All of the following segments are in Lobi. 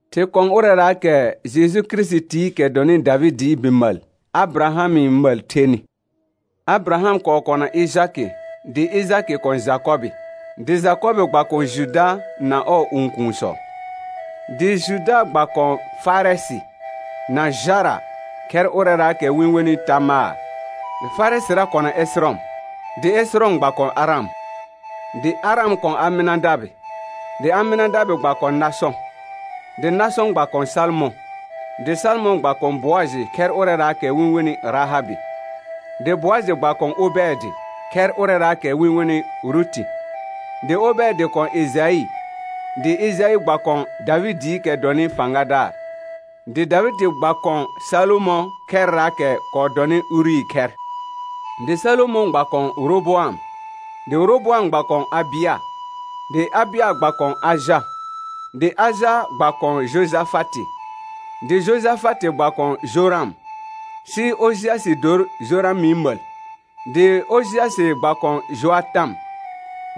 Thɩ kɔ̃ ʋrɛraakɛ Jeju Kirisitikɛ dɔnɩ Davɩdɩɩ bi məl, Abɩrahamɩ məl thenɩ. Abɩraham kɔɔ kɔna Ɩjkɩ dɩ Ɩjakɩ kɔ̃ Jakɔbɩ, dɩ Jakɔbɩ gba kɔ̃ Juda na ɔɔ õkuunsɔ; dɩ Juda gba kɔ̃ Farɛsɩ na Jara khɛr ʋrɛraakɛ wɩ-n wenɩ Tamaar, dɩ Farɛsɩra kɔna Ɛsɩrɔm, dɩ Ɛsɩrɔm gba kɔ̃ Aram; dɩ Aram kɔ̃ Amɩnadabɩ, dɩ Amɩnadabɩ gba kɔ̃ Nasɔ̃, dɩ Nasɔ̃ gba kɔ̃ Salmɔ̃; dɩ Salmɔ̃ gba kɔ̃ Boajɩ khɛr ʋrɛraakɛ wɩ-n wenɩ Rahabɩ, dɩ Boajɩ gba kɔ̃ Obɛɛdɩ khɛr ʋrɛraakɛ wɩ-n wenɩ Ruti; dɩ Obɛɛdɩ kɔ̃ Ɩjaɩ, dɩ Ɩjaɩ gba kɔ̃ Davɩdɩɩkɛ dɔnɩ fãgadaar. Dɩ Davɩdɩ gba kɔ̃ Salomɔ̃ khɛrraakɛ kɔɔ dɔnɩ Urii khɛr; dɩ Salomɔ̃ gba kɔ̃ Roboam, dɩ Roboam gba kɔ̃ Abɩa, dɩ Abɩa gba kɔ̃ Aja; dɩ Aja gba kɔ̃ Jojafatɩ, dɩ Jojafatɩ gba kɔ̃ Joram, sɩ Ojɩasɩ dor Joramɩ məl; dɩ Ojɩasɩ gba kɔ̃ Joatam,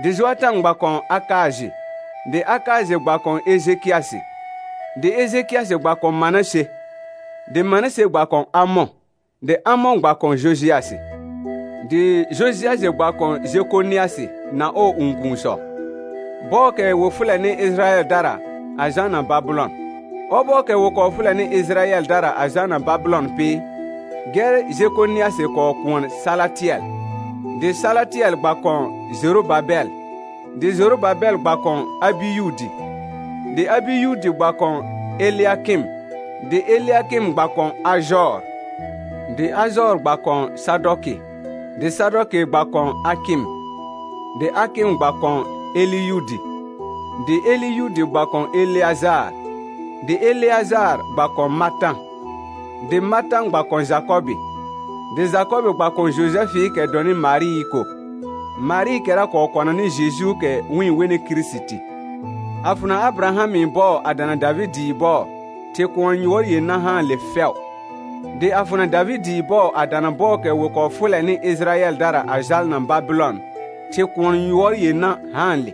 dɩ Joatam gba kɔ̃ Akaajɩ, dɩ Akaajɩ gba kɔ̃ Ejekɩasɩ; dɩ Ejekɩasɩ gba kɔ̃ Manase, dɩ Manase gba kɔ̃ Amɔ̃, dɩ Amɔ̃ gba kɔ̃ Jojɩasɩ; dɩ Jojɩasɩ gba kɔ̃ Jekonɩasɩ na ɔɔ õkuunsɔ, bɔɔkɛ wɩ fʋlɛnɩ Ɩjɩrayɛldara a jalna Babɩlɔn. Ɔbɔɔkɛ wɩ kɔɔ fʋlɛnɩ Ɩjɩrayɛldara a jalna Babɩlɔn pɩ, gɛr Jekonɩasɩ kɔɔ kʋɔn Salatɩɛl, dɩ Salatɩɛl gba kɔ̃ Jorobabɛl; dɩ Jorobabɛl gba kɔ̃ Abiyudi, dɩ Abiyudi gba kɔ̃ Elɩakɩm, dɩ Elɩakɩm gba kɔ̃ Ajɔɔr; dɩ Ajɔɔr gba kɔ̃ Sadɔkɩ, dɩ Sadɔkɩ gba kɔ̃ Akɩm, dɩ Akɩm gba kɔ̃ Eliyudi; dɩ Eliyudi gba kɔ̃ Eleajaar, dɩ Eleajaar gba kɔ̃ Matã, dɩ Matã gba kɔ̃ Jakɔbɩ; dɩ Jakɔbɩ gba kɔ̃ Jojɛfɩɩkɛ dɔnɩ Marɩɩ ko, Marɩɩkɛra kɔɔ kɔnanɩ Jejuukɛ wɩ-n wenɩ Kirisiti. A fʋna Abɩrahamɩ bɔɔ a dana Davɩdɩɩ bɔɔ, thɩ kʋɔn yʋɔr yenã haanle fɛʋ; dɩ a fʋna Davɩdɩɩ bɔɔ a dana bɔɔkɛ wɩ kɔɔ fʋlɛnɩ Ɩjɩrayɛldara a jalna Babɩlɔn, thɩ kʋɔn yʋɔr yenã haanle,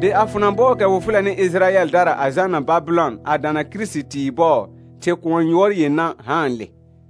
dɩ a fʋna bɔɔkɛ wɩ fʋlɛnɩ Ɩjɩryɛldara a jalna Babɩlɔn a dana Kirisitii bɔɔ, thɩ kʋɔn yʋɔr yenã haanle.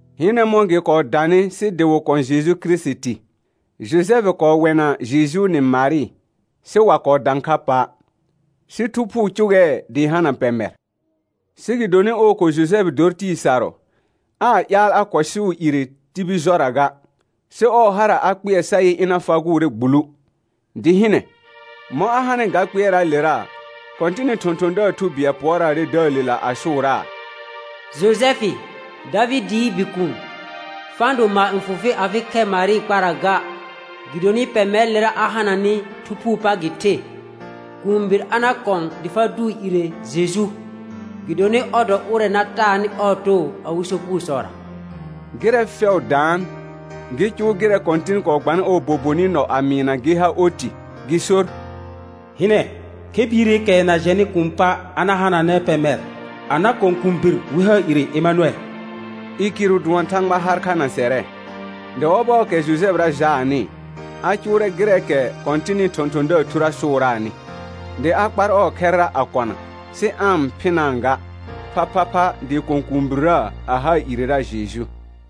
Hɩnɛ mɔ̃ gɩ kɔɔ danɩ sɩ dɩ wɩ kɔ̃ Jeju Kirisiti. Jojɛfɩ kɔɔ wɛna Jejuu nɩ Marɩ, sɩ wa kɔɔ dã kha pa', sɩ Thu Phuu cʋgɛɛ dɩ hana pɛmɛr. Sɩ gɩdonɩ ɔɔ ko Jojɛfɩ dor tɩɩ sarʋ, aa ƴaal a kʋɛsʋʋ ire tibil jɔra ga, sɩ ɔɔ hara a kpɩɛr sa yɩ ɩna fagʋʋrɛ gbulu. Dɩ hɩnɛ, mɔ̃ a hanɩ ga kpɩɛraalera, Kɔ̃tɩnɩ thɔ̃thɔ̃daar thu bɩɛl pʋɔraarɛ dəəlela a sʋʋraa: Jojɛfɩ, Davɩdɩɩ bikuun, fa-n do maar n fʋ fɩ afɩ khɛr Marɩɩ kpara ga, gɩdonɩ pɛmɛrɩlera a hananɩ Thu Phuu pa gɩ the. Kũubir a na kɔ̃ dɩ fa dʋʋ ire Jeju, gɩdonɩ ɔr dɔ ʋrɛ na taanɩ ɔɔ too awɩ sopugosɔra. Gɩrɛ fɛʋ daan, gɩ cʋʋ gɩrɛ Kɔ̃tɩn kɔɔ gbanɩ ɔɔ bobonɩ nɔ a mɩɩna gɩ ha oti, gɩ sor: «Hɩnɛ, khɛ biireekɛ na jɛnɩ kuun pa', a na hananɛ pɛmɛr a na kɔ̃ kũubir, wɩ haa ire Emanʋɛl», i kɩrʋ dʋɔn Thãgba har kha na sɛrɛ. Dɩ ɔbɔɔkɛ Jojɛfɩra jaanɩ, a cʋʋrɛ gɩrɛɛkɛ Kɔ̃tɩnɩ thɔ̃thɔ̃daar thurə sʋʋraanɩ, dɩ a kpar ɔɔ khɛrra a kɔna, sɩ aa-n phɩnaa ga, phaphapha dɩ kɔ̃ kũubirrə a haa irera Jeju.